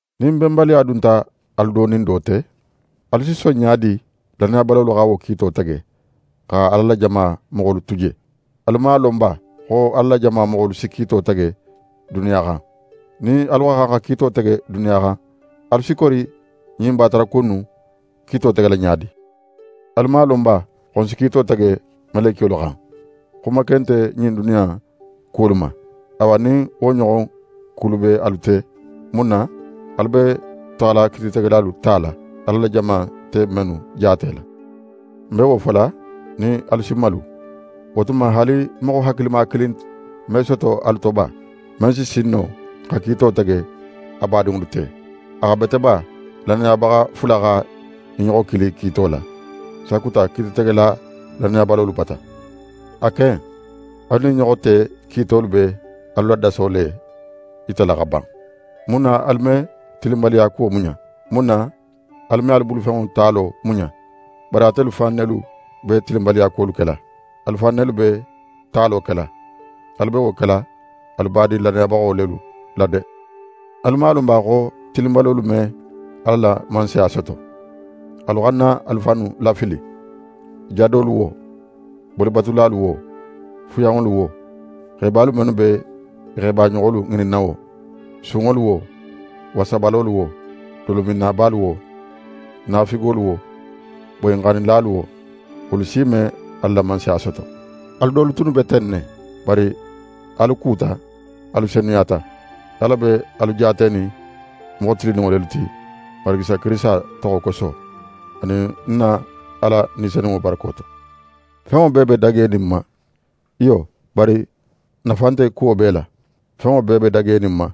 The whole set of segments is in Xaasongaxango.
Nin benbaliya dunta alu do nin do te, alu si son ɲa di lannayabalolu xa wo kiito tege, xa Ala la jama moxolu tu je? Alu man a lon ba xo Ala la jama moxolu si kiito tege duniya xan? Nin alu xa xan xa kiito tege duniya xan, alu si kori ɲin bataraku innu kiito tegela ɲa di? Alu man a lon ba xo n si kiito tege melekiyolu xan? Xuma ken nte ɲin duniya in kuwolu ma! Awa nin wo ɲoxon kulu be alu te, mun na alu be taxala kiititegelalu tala, Ala la jama nte mennu jaatela? Ń be wo fola nin alu si malu. Wo tuma haali moxo hakilima kilin me soto alu to ba, men si sin no xa kiito tege a badinŋolu te? A xa bete ba lannayabaxa fula xa i ɲoxo kili kiito la, sakuta kiititegela lannayabalolu bata? A ken, alu nin i ɲoxo te kiitolu be alu la daso le yitala xa ban. Mun na alu me tilinbaliyakuwo muɲa? Mun na alu me alu bulufenŋo talo muɲa? Bari atelu fan nelu be tilinbaliyakuwolu kela. Alu fan nelu be talo kela. Alu be wo kela alu badin lannayabaxo lelu la de! Alu man a lon ba xo tilinbalolu me Ala la Mansaya soto? Alu xana alu fannu lafili. Jadolu wo, bolibatulalu wo, fuyanŋolu wo, xebalu mennu be i xebaɲoxolu ŋininna wo, sunŋolu wo, wasabalolu wo, dolominnabalu wo, naafigolu wo, boyinxannilalu wo, wolu si me Ala la Mansaya soto. Alu dolu tunnu be ten ne; bari alu kuta, alu senuyata. Ala be alu jaatenin moxo tilinninŋo lelu ti Marigi Isa Kirisita toxo koso, anin n na Ala Ni Senunŋo barako to. «Fenŋo bee be dagenin ń ma.» Iyo, bari nafa nte kuwo bee la. «Fenŋo bee be dagenin ń ma»,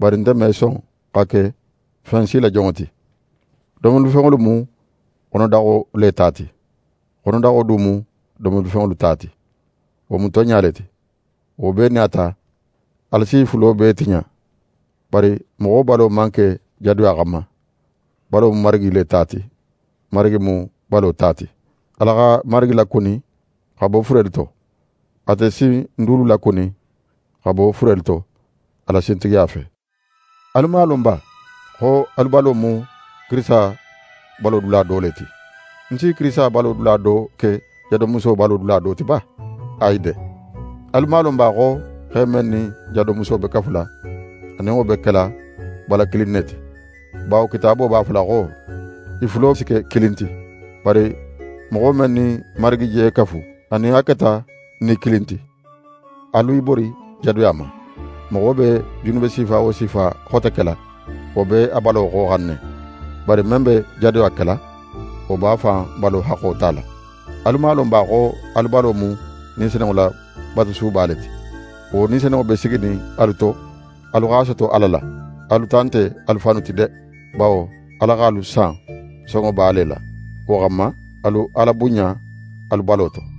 bari nte me son xa ke fen si la jonŋo ti. Domolifenŋolu mu xonodaxo le ta ti, xonodaxo du mu domolifenŋolu ta ti. Wo mu tonɲa le ti. Wo bee nin a ta, Ala si i fulo bee tiɲa. Bari moxo balo man ke jadoya xanma. Balo mu Marigi le ta ti, Marigi mu balo ta ti. Ala xa Marigi lakuni xa bo furelu to. Ate si n dulu lakuni xa bo furelu to, a la sintigiya fe. Alu man a lon ba xo alu balo mu Kirisita balo dula do le ti? Ń si Kirisita balo dula do ke jadomuso balo dula do ti ba? Ayi de! Alu man a lon ba xo xe men nin jadomuso be kafula, a nin wo be kela bala kilin ne ti? Bawo Kitaabo b'a fola xo: «I fulo si ke kilin ti.» Bari moxo men nin Marigi je kafu, a nin a keta ni kilin ti. Alu i bori jadoya ma. Moxo be junube sifa wo sifa xote kela, wo be a balo xoxan ne, bari men be jadoya kela, wo b'a fan balo haxxo tala. Alu man a lon ba xo alu balo mu Ni Senunŋo la batusuba le ti? Wo Ni Senunŋo be siginin alu to; alu x'a soto Ala la. Alu ta nte alu fannu ti de! Bawo, Ala x'alu san sonŋoba le la. Wo xanma, alu Ala bunɲa alu balo to.